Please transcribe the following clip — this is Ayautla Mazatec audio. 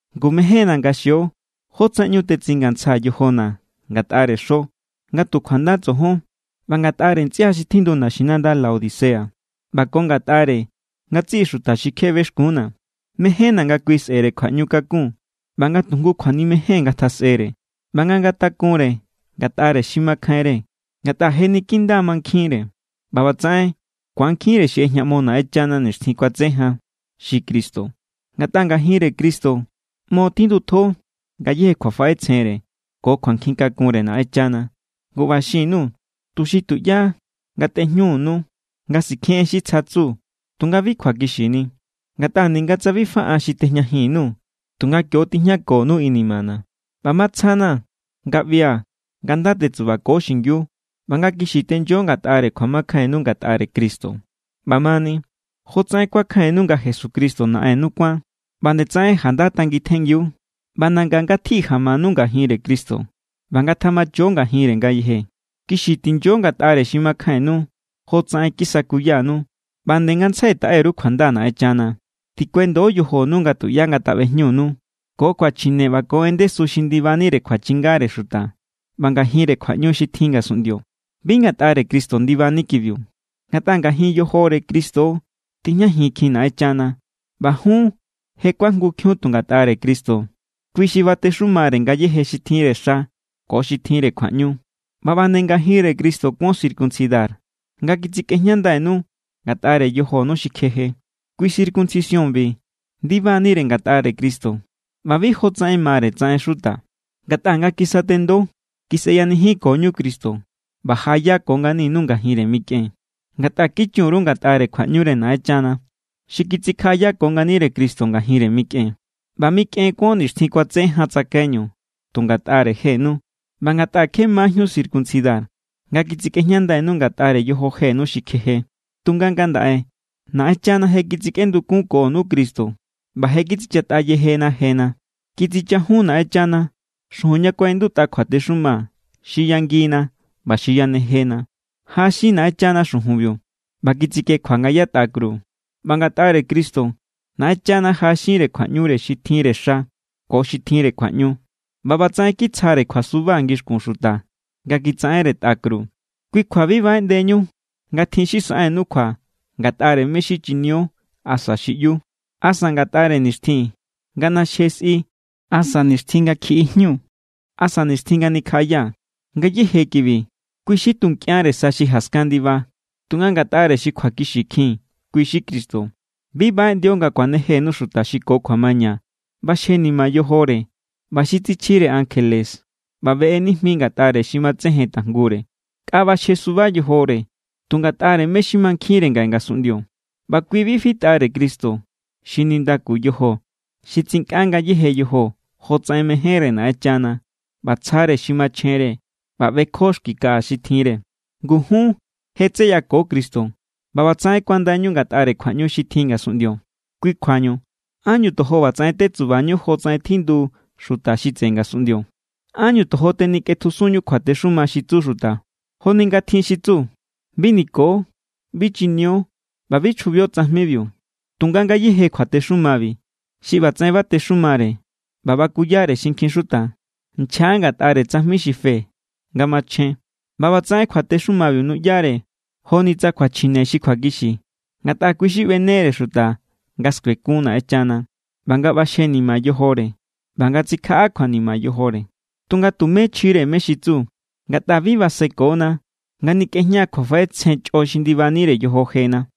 Ngu mejénna̱ nga xio jótsaꞌen ꞌñu tetsingantsjaa̱ yojona̱ ngatꞌare xo nga tu kjuanda tsojon, ꞌba ngatꞌare ntsꞌia xi tjindu naxinanda Laodicea, ꞌba ko ngatꞌare ngatsiꞌi xuta xi kje bexkuúnna̱. Mejénna̱ nga kui sꞌe̱re kjuaꞌñu kakun, ꞌba nga tu jngu kjuanimejen ngatjasꞌere, ꞌba nga ngatakunre ngatꞌare xi makjainre ngatꞌa je niki nda= mankjinre. ꞌBa ꞌbatsaꞌen ku̱ankjinre xi ꞌejñaꞌmo Naꞌenchana nixtjin kuatse jan, xi Cristo. Ngatꞌa ngajinre Cristo ꞌmo tjindutjo ngayéje kjuafaꞌetsjenre ko kjuankjin kakunre Naꞌenchana. Ngu ꞌba xin_nuu̱ tuxi tuꞌyá ngatꞌejñunu nga sikjen en xi tsja tsu tunga bi kjuakixini. Ngatꞌa ninga tsa bi fa an xi tejñajin_nuu̱, tunga kio= tijñakonu inimana̱. ꞌBa matsja=na̱ nga ꞌbia̱ nga nda tetsubako xingiu ꞌba nga kixi tenyo ngatꞌare kjuamakjainnu ngatꞌare Cristo. ꞌBamani, jotsaꞌen kuakjainnu nga Jesucristo Naꞌennu kuán, ꞌba nde tsaꞌen janda tangitjenngiu. ꞌBa nanga ngatji jamanu ngajinre Cristo ꞌba ngatjamacho ngajinre ngayeje. Kixi tinyo ngatꞌare xi makjainnu, jotsaꞌen kisakuyanu. ꞌBa nde ngantsjai taꞌe_ru kjuanda Naꞌenchana. Tikuendo yojonu nga tuꞌyá ngataꞌbejñunu ko kjuachjine ꞌba ko en ndesu xi ndibanire kjuachingare xuta ꞌba ngajinre kjuaꞌñu xi tjin ngasunꞌndio. Bi ngatꞌare Cristo ndibani kibiu. Ngatꞌa ngajin yojore Cristo= tijñajinkjin Naꞌenchana. ꞌBa jun je kuajngukjiun tu ngatꞌare Cristo. Kui xi batexumare ngayéje xi tjinre xa ko xi tjinre kjuaꞌñu. ꞌBa ꞌba nde ngajinre Cristo kuon circuncidar, nga kitsikꞌejñandainu ngatꞌare yojonu xi kjeje. Kui circuncisiónbi ndibanire ngatꞌare Cristo ꞌba bi jotsaꞌen mare tsaꞌen xuta. Ngatꞌa nga kisatendo, kisꞌeyanijinkoñu Cristo ꞌba jaꞌayako nganinu ngajinre mikꞌen, ngatꞌa kichun_ru ngatꞌare kjuaꞌñure Naꞌenchana xi kitsikjaꞌayako nganire Cristo ngajinre mikꞌen. ꞌBa mikꞌen kuon nixtjin kuatse jan tsakaiñu tu ngatꞌare jenu ꞌba ngatꞌa kje majíun circuncidar nga kitsikꞌejñandainu ngatꞌare yojonu xi kjeje. Tunga ngandaꞌe Naꞌenchana je kitsikꞌendukunkonu Cristo ꞌba je kitsichatꞌa yejena jena. Kitsichajun Naꞌenchana xujun ña kuaꞌindutꞌa kjuatexuma xi yangina ꞌba xi yanejena. Jaꞌaxin Naꞌenchana xujunbiu ꞌba kitsikjekjua nga yatꞌa kru. ꞌBa ngatꞌare Cristo Naꞌenchana jaꞌaxinre kjuaꞌñure xi tjinre xa ko xi tjinre kjuaꞌñu ꞌba ꞌbatsaꞌen kitsjare kjuasuba ngixkun xuta nga kitsaꞌenre tꞌa kru. Kui kjua bi baꞌeꞌndeñu nga tjin xi saꞌennu kjua ngatꞌare mé= xi chinio asa xi ꞌyu, asa ngatꞌare nixtjin nga ꞌnaxje sꞌi, asa nixtjin nga kjiꞌijñu, asa nixtjin nga nikjaꞌaya. Ngayéje kibi, kui xi tu nkꞌianre sa xi jaskan ndiba. Tunga ngatꞌare xi kjuakixikjin, kui= xi Cristo. Bi baꞌeꞌndio nga kuanejenu xuta xi ko kjuamaña ꞌbaxjenima yojore ꞌba xi tsichjire ankjele ꞌba beꞌe nijmi ngatꞌare xi matsejen tajngure. Nkꞌa ꞌbaxjesuba yojore tu ngatꞌare mé= xi mankjinre ngaꞌe ngasunꞌndio. ꞌBa kui bi fitꞌare Cristo xi nindaku yojo xi tsinkꞌa ngayéje yojo jotsaꞌen mejénre Naꞌenchana ꞌba tsjare xi machjenre ꞌba ꞌbekjo xki kaꞌa xi tjinre. Ngu jun je tseyako Cristo ꞌba ꞌbatsaꞌen kuandainu ngatꞌare kjuaꞌñu xi tjin ngasunꞌndio. Kui kjuañu, ¿ánñu tojo ꞌbatsaꞌen tetsubañu jotsaꞌen tjindu xuta xi tseꞌe ngasunꞌndio? ¿Ánñu tojo tenikꞌetjusunñu kjuatexuma xi tsu xuta? Joni nga tjin xi tsu: “Bi niko, bi chinio ꞌba bi chjubio tsajmibiu.” Tunga ngayéje kjuatexumabi xi ꞌbatsaꞌen batexumare ꞌba bakuyare xinkjin xuta, nchja= ngatꞌare tsajmi xi fe nga machjen. ꞌBa ꞌbatsaꞌen kjuatexumabiu nuꞌyare joni tsa kjuachjine xi kjuakixi, ngatꞌa kui xi ꞌbenere xuta nga skuekun Naꞌenchana ꞌba nga ꞌbaxjenima yojore ꞌba nga tsikjaꞌa kjuanima yojore. Tunga tumé chjinire mé= xi tsu, ngatꞌa bi basekona nga nikꞌejña kjuafaꞌetsjen chꞌo xi ndibanire yojo jena.